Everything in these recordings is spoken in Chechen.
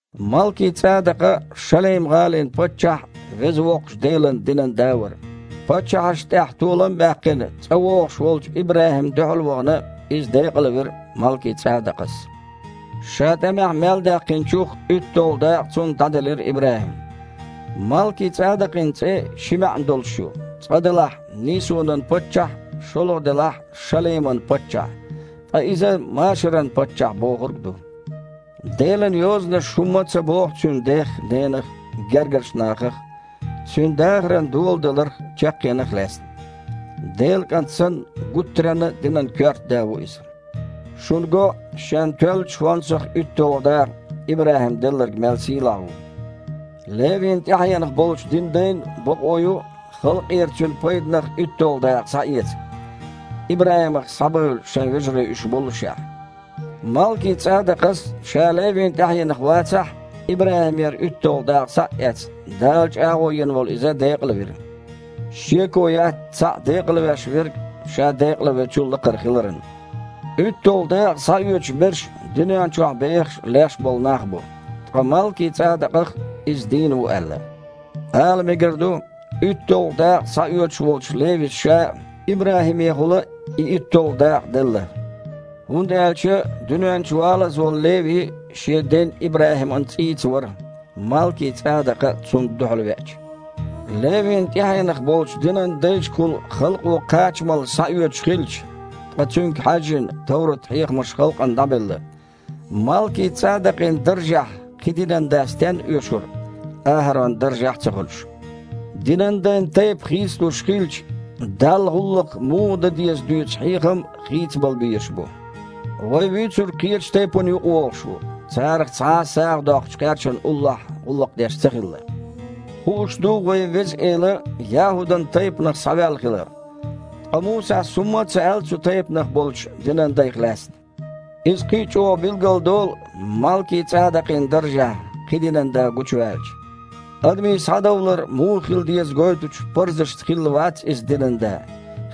Малки-ЦІадакъа Шалейм-гІалин паччахь а, Веза Воккхачу Делан динан да а вара. Паччахьашна тІехь толам а баьккхина, цІа вогІуш волчу ИбрахІимна дуьхьал а вахана, иза декъалвира Малки-ЦІадакъас. Ша тІамехь мел даьккхинчух уьтталгІа дакъа цунна дІаделира ИбрахІима. Малки-ЦІадакъин цІе ши маьІна долуш ю: цкъа-делахь, «нийсонан паччахь», шолгІа-делахь «Шалейман паччахь», ткъа иза «машаран паччахь» бохург ду. Делан Йозанаша хІумма а ца боху цуьнан дех а, ненах а, гергарчу нахах а, цуьнан дахаран доладаларх а, чаккхенах а лаьцна. Делан КІант санна, гуттаренна а динан коьрта да ву иза. Шуна го, шен тоьллачу хІонсах уьтталгІа дакъа ИбрахІима делларг мел сийлахь ву. Левин тІаьхьенах болчу динан дайн бакъо ю халкъера цуьнан пайданах уьтталгІа дакъа схьаэца, ИбрахІимах схьабевлла шайн вежарий уьш боллушехь. Малки-ЦІадакъас, ша Левин тІаьхьенах вацахь а, ИбрахІимера уьтталгІа дакъа схьа а эцна, Дала чІагІо йина волу иза декъалвира. Шеко яц цхьаъ декъалвеш верг ша декъалвечул а лакхара хиларан. УьтталгІа дакъа схьаоьцуш берш дуьнен чохь бехаш а, леш а болу нах бу, ткъа Малки-ЦІадакъах – иза дийна ву аьлла. Ала мегар ду, уьтталгІа дакъа схьаоьцуш волчу Левис ша а ИбрахІимехула и уьтталгІа дакъа делла. ХІунда аьлча дуьнен чу валаза волу Леви шен ден ИбрахІиман цІийца вара, Малки-ЦІадакъа цунна дуьхьалвеача. Левин тІаьхьенах болчу динан дайшкахула халкъо кхачамалла схьаоьцуш хилча (ткъа цуьнга хьаьжжина, товрат-хьехамаш халкъана дІабелла), Малки-ЦІадакъин даржехь кхин динан да стенна оьшура, АхІаронан даржехь а ца хуьлуш? Динан дайн тайпа хийцалуш хилча, Далла гІуллакх муха дан деза дуьйцу хьехам а хийцабала безаш бу. Вай Вуьйцург кхечу тайпанна юкъавогІуш ву, царах цхьа а сагІа доккхучу кхерчана уллохь гІуллакх деш ца хилла. Хууш ду, вайн Веза Эла ЯхІудан тайпанах схьаваьлла хилар. Ткъа Мусас хІумма а ца аьлла цу тайпанах болчу динан дайх лаьцна. Иза кхин а чІогІа билгалдолу, Малки-ЦІадакъин даржехь кхин динан да гучуваьлча. Адамийн схьадовлар муха хила деза гойтучу парзашца хилла вац Иза динан да,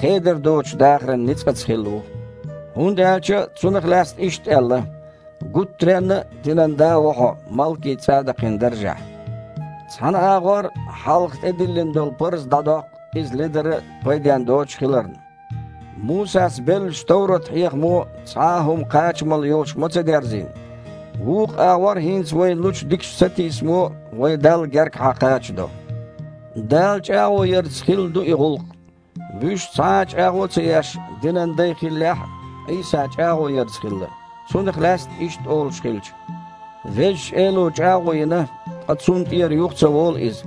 хедар доцучу дахаран ницкъаца хилла ву. ХІунда аьлча Цунах лаьцна иштта аьлла: «Гуттаренна а динан да ву Хьо Малки-ЦІадакъин даржехь». Цхьана агІор хьалха тІедиллина хилла парз дІадоккху, иза ледара а, пайден доцуш а хиларна, (Мусас беллачу товрат-хьехамо цхьа а хІума кхачамалла йолуш ма ца дерзийна), вукху агІор хІинца вайна лучу дикачу сатийсамо вай Далла гергахьа кхачадо. Дала чІагІо ярца хилла ду и гІуллакх. Вуьш, цхьа а чІагІо ца еш, динан дай хиллехь а, Іийса чІагІо ярца хилла, Цунах лаьцна иштта олуш хилча: «Везачу Эло чІагІо йина, ткъа цунна тІера юха ца волу Иза: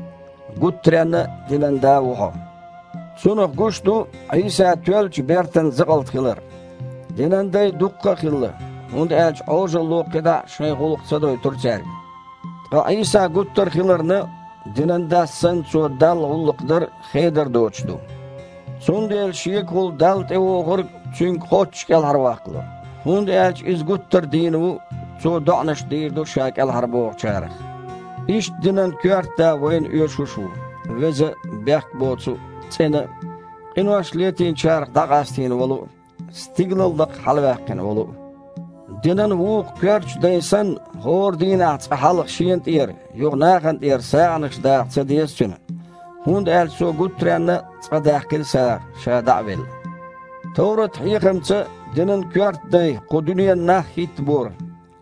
„Гуттаренна а динан да ву Хьо“». Цунах гуш ду Іийса тоьллачу бертан закъалт хилар. Динан дай дуккха а хилла, хІунда аьлча Іожалло кхидІа шайн гІуллакх ца дойтура цаьрга. Ткъа Іийса гуттар а хиларна, динан дас санна Цо Далла гІуллакх дар а хедар доцуш ду. Цундела Шегахула Далла тІевогІург Цуьнга кхоччуш кІелхьарваккхало, хІунда аьлча Иза гуттар а дийна ву, Цо доІанаш дийр ду Ша кІелхьарбохучарах. Иштта динан коьрта да вайна оьшуш а ву: веза а, бехк боцу а, цІена а, къинош летийначарах дІакъастийна волу а, стигалал лакха хьалаваьккхина волу а. Динан вукху коьртачу дайн санна, хІора дийнахь цкъа хьалха Шена тІера, юха нахана тІера сагІанаш даха ца деза Цуьнан, хІунда аьлча Цо гуттаренна а цкъа даьккхина сагІа, Ша дІа а велла. Товрат-хьехамца динан коьрта дай кху дуьненан нах хІиттабора,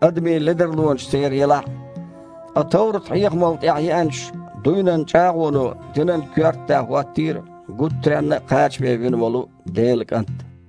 адамийн ледарлонаш церан елахь а. Ткъа товрат-хьехамал тІаьхьа еанчу дуйнан чІагІоно динан коьрта да хІоттийра гуттаренна а кхачаме вина волу Делан КІант.